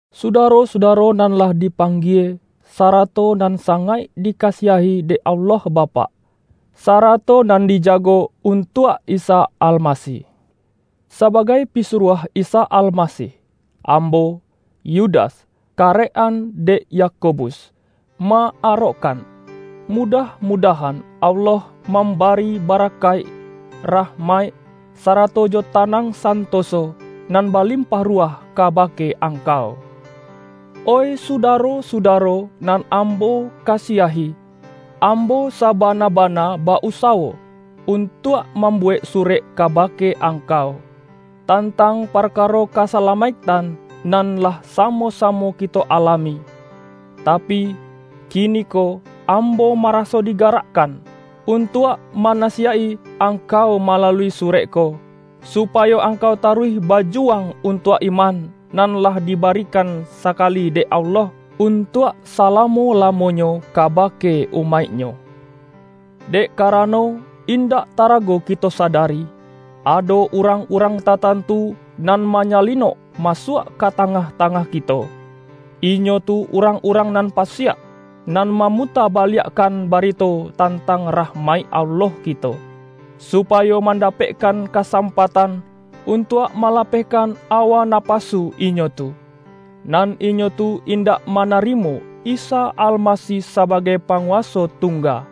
Sudaro-sudaro nan lah dipang-gie, sarato nan sangaik dikasiahi dek Allah Bapak, sarato nan dijago untuak Isa Almasih. Sabagai pisuruah Isa Almasih, ambo — Yudas — karek-an dek Yakobus, ma-arokkan: Mudah-mudahan Allah mambari bara-kaik, rahmaik, sarato jo tanang santoso nan balimpah ruwah kabake angkau. Oih sudaro-sudaro nan ambo ka-siahi! Ambo sabana-bana ba-usawo un-tuak mambuwek surek kabake angkau, tantang parkaro kasalamaiktan nan lah samo-samo kito alami. Tapi, kiniko am-bo maraso digarakkan, untuak manasi-yaik-i angkau malalui surek ko, supayo angkau taruih bajuwang untuak iman, nan lah dibarikan sakali dek Allah un-tuak salamo-lamonyo kabake umaik-Nyo. Dek karano, indak tarago kito sadari, ado urang-urang tatantu nan ma-nyalinok masuak ka tangah-tangah kito. Inyo tu urang-urang nan pasiak, nan ma-muta baliakkan barito tantang rahmaik Allah kito, supayo mandapekkan kasam-patan untuak malapehkan awa napasu inyo tu. Nan inyo tu indak manarimo Isa Almasih sabagai Panguwaso Tungga,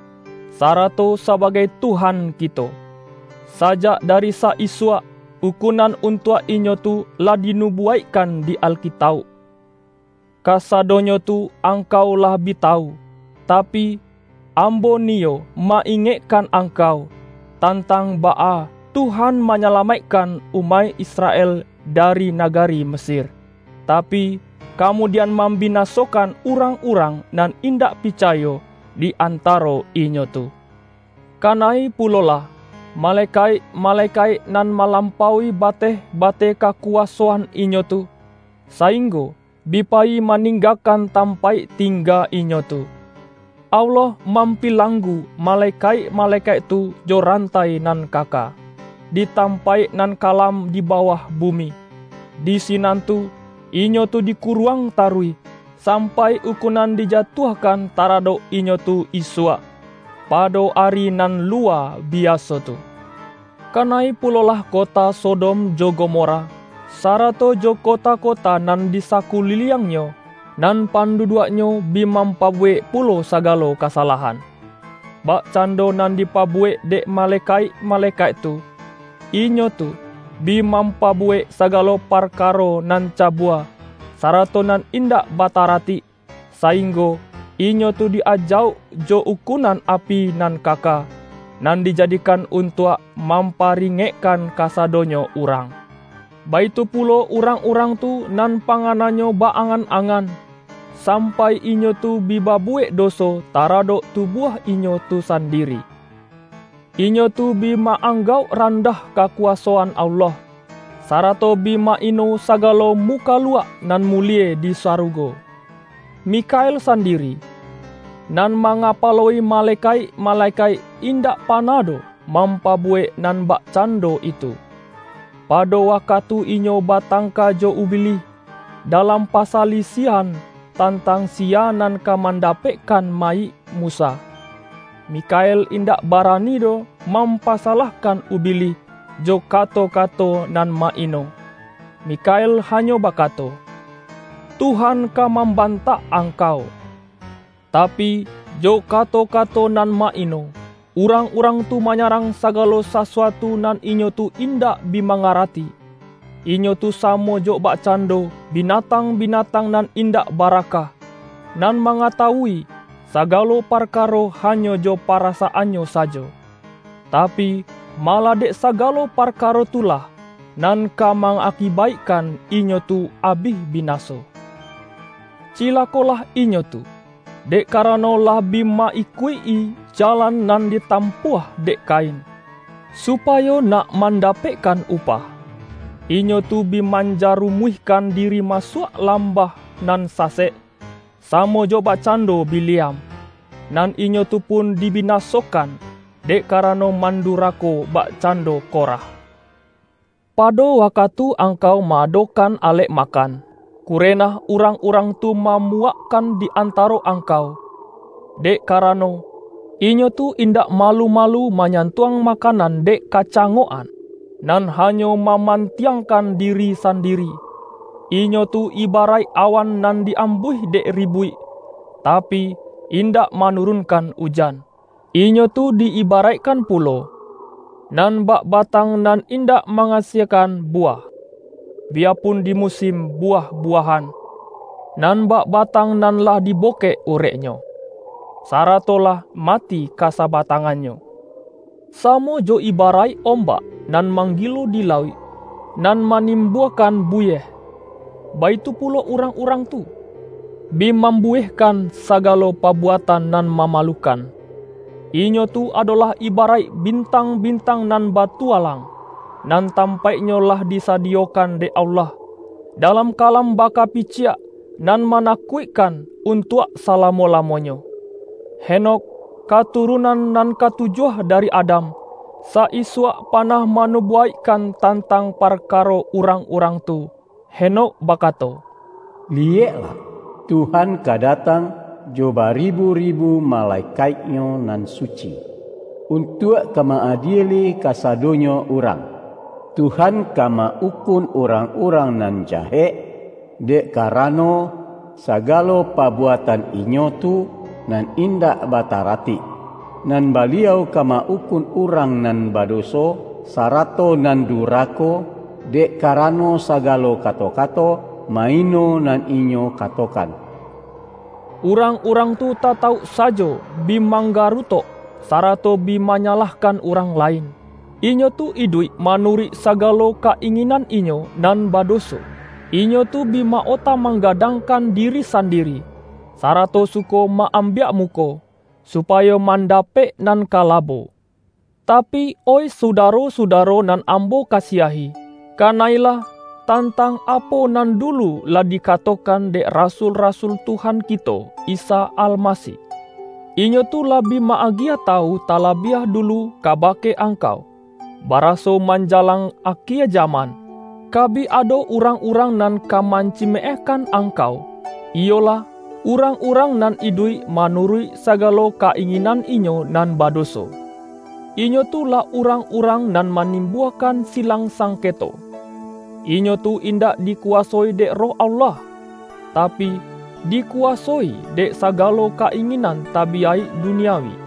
sa-rato sabagai Tuhan kito. Sajak dari sa-isuak, ukunan untuak inyo tu lah dinu-buwaikkan di Alkitauk. Kasadonyo tu angkau lah bi tawu. Tapi, ambo niyo ma-ingekkan angkau, tantang baa Tuhan manyalamaikkan umaik Israel dari nagari Mesir, tapi, kamudian mambinasokan urang-urang nan indak picayo, di antaro inyo tu. Kana-i pulolah, malekaik-malekaik nan malampaui bateh-bateh kakuwasoan inyo tu, sainggo bi payi maning-gakan tampaik tingga inyo tu. Allah mampilanggu malekaik-malekaik tu jo rantai nan kaka, di tampaik nan kalam di bawah bumi. Di sinan tu, inyo tu di-kuruang taruih, sampai ukunan dija-tuahkan taradok inyo tu isuak, pado Ari nan luwa biaso tu. Kana-i pulolah kota Sodom jo Gomora, sarato jo kota-kota nan di sakuliliangnyo, nan pandu-duaknyo bi mampabuwek pulo sagalo kasalahan, bakcando nan dipabuwek dek malekaik-malekaik tu. Inyo tu bi mampabuwek sagalo parkaro nan ca-bua, sarato nan indak bataratik, saing-go inyo tu di-ajauk jo ukunan api nan kaka, nan dijadikan untuak mampari-ngekkan kasadonyo urang. Baitu pulo urang-urang tu nan pa-ngananyo ba-angan-angan, sampai inyo tu bi babuwek doso taradok tu-buah inyo tu sandiri. Inyo tu bi ma-ang-gauk randah kakuwasoan Allah, sarato bi ma-ino sagalo mukaluak nan mulie di sarugo. Mikhael sandiri, nan ma-ngapalo-i malekaik-malekaik, indak panah doh mampabuwek nan bakcan-do itu. Pado wakatu inyo batangka jo Ubilih, dalam pasalisiahan tantang siya nan ka mandapekkan mayik Musa, Mi-khael indak barani doh mampasalahkan Ubilih jo kato-kato nan ma-ino. Mikha-el hanyo bakato,”Tuhan ka mamban-tak angkau!” Tapi, jo kato-kato nan ma-ino, urang-urang tu manyarang sa-galo sasuatu nan inyo tu indak bi ma-ngarati. Inyo tu samo jo bakcando bi-natang-binatang nan indak baraka, nan mangatawui sagalo parkaro hanyo jo parasaannyo sajo. Tapi, malah dek saga-lo parkaro tu lah, nan ka ma-akibaikkan inyo tu abih binaso. Cilakolah inyo tu, dek karano lah bi ma-ikuik-i jalan nan ditampuah dek Kain. Supayo nak mandapekkan upah, inyo tu bi manja-rumuihkan diri masuak lambah nan sa-sek, samo jo bakcando Bileam. Nan inyo tu pun di binasokan, dek karano man-durako bakcando Korah. Pado waka-tu angkau ma-adokan alek makan, ku-renah urang-urang tu mamuwakkan di antaro angkau. Dek karano, inyo tu in-dak malu-malu manyantuang makanan dek kacangok-an, nan hanyo maman-tiangkan diri sandiri. Inyo tu ibaraik awan nan di-ambuih dek ribuik, tapi, indak manurunkan ujan. Inyo tu di-iba-raikkan pulo, nan bak batang nan indak ma-asiekan buwah, biyapun di musin buwah-buwahan; nan bak batang nan lah dibokek ureknyo, sarato lah mati ka sabatang-annyo. Samo jo ibaraik om-bak nan manggilo di lauik, nan manim-buakan buwieh, baitu pulo urang-urang tu, bi mambuwiehkan sagalo pabuatan nan mamalukan. Inyo tu adolah ibaraik bintang-bintang nan batualang, nan tampaiknyo lah disadiyokan dek Allah, dalam kalam bakapiciak nan manakuik-kan untuak salamo-lamonyo. Henokh, katurunan nan katujuah dari Adam, sa-isuak panah manubu-waikkan tantang parkaro urang-urang tu. Henokh bakato,”Liyeklah, Tuhan ka datang jo baribu-ribu malekaik-Nyo nan suci, untuak ka ma-adieli kasa-donyo urang. Tuhan ka ma-ukun urang-urang nan jahek, dek karano, sagalo pa-buatan inyo tu nan indak bataratik. Nan Baliau ka ma-ukun urang nan badoso, sarato nan durako, dek karano sagalo kato-kato ma-ino nan inyo katokan.” Urang-urang tu tatauk sajo bi manggarutok, sarato bi manyalahkan urang lain. Inyo tu iduik manuruik sa-galo ka-inginan inyo nan badoso. Inyo tu bi ma-ota manggadangkan diri san-diri, sarato suko ma-ambiak muko, su-payo mandapek nan ka labo. Tapi, oih sudaro-sudaro nan ambo kasiahi, kana-ilah, tantang apo nan du-lu lah dikatokan dek rasul-rasul Tuhan kito Isa Almasih. Inyo tu lah bi ma-agiah tawu talabiah dulu kabake ang-kau, baraso manjalang akie jaman, ka bi ado urang-urang nan ka mancimeehkan angkau, iyolah, urang-urang nan iduik manuruik sagalo ka-inginan inyo nan badoso. Inyo tu lah urang-urang nan manimbuakan silang sangketo. Inyo tu indak dikuwasoi dek Roh Allah, tapi, di-kuwasoi dek sagalo ka-inginan tabiyaik duniawi.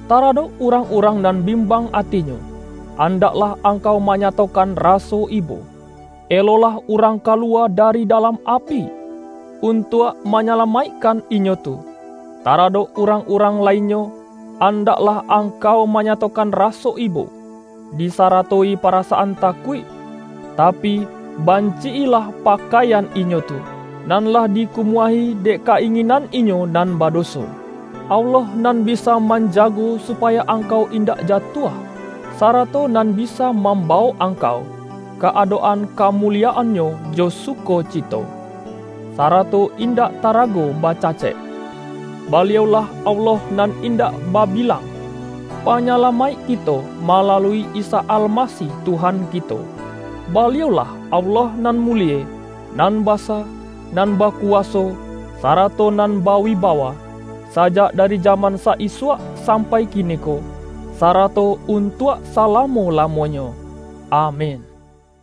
Taradok urang-urang nan bimbang atinyo, andaklah angkau manyatokan raso ibo. Elolah urang kaluwa da-ri dalam api, untuak manyalamaikkan inyo tu. Taradok urang-urang lainnyo, andaklah angkau manyatokan raso ibo, disaratoi parasaan takuik, tapi, banci-ilah pakaian inyo tu, nan lah dikumuahi dek ka-inginan inyo nan badoso. Allah nan bisa manjago supayo angkau indak jatuah, sarato nan bisa mambawok angkau ka adok-an kamu-liyaan-Nyo jo sukocito, sarato indak ta-rago bacacek, Baliau-lah Allah nan indak babilang, Panyalamaik kito ma-lalui Isa Almasih Tuhan kito. Baliau-lah Allah nan mulie, nan basa, nan baku-waso, sarato nan bawibawa, sajak da-ri jaman sa-isuak sampai kiniko, sarato untuak salamo-lamonyo! Amin!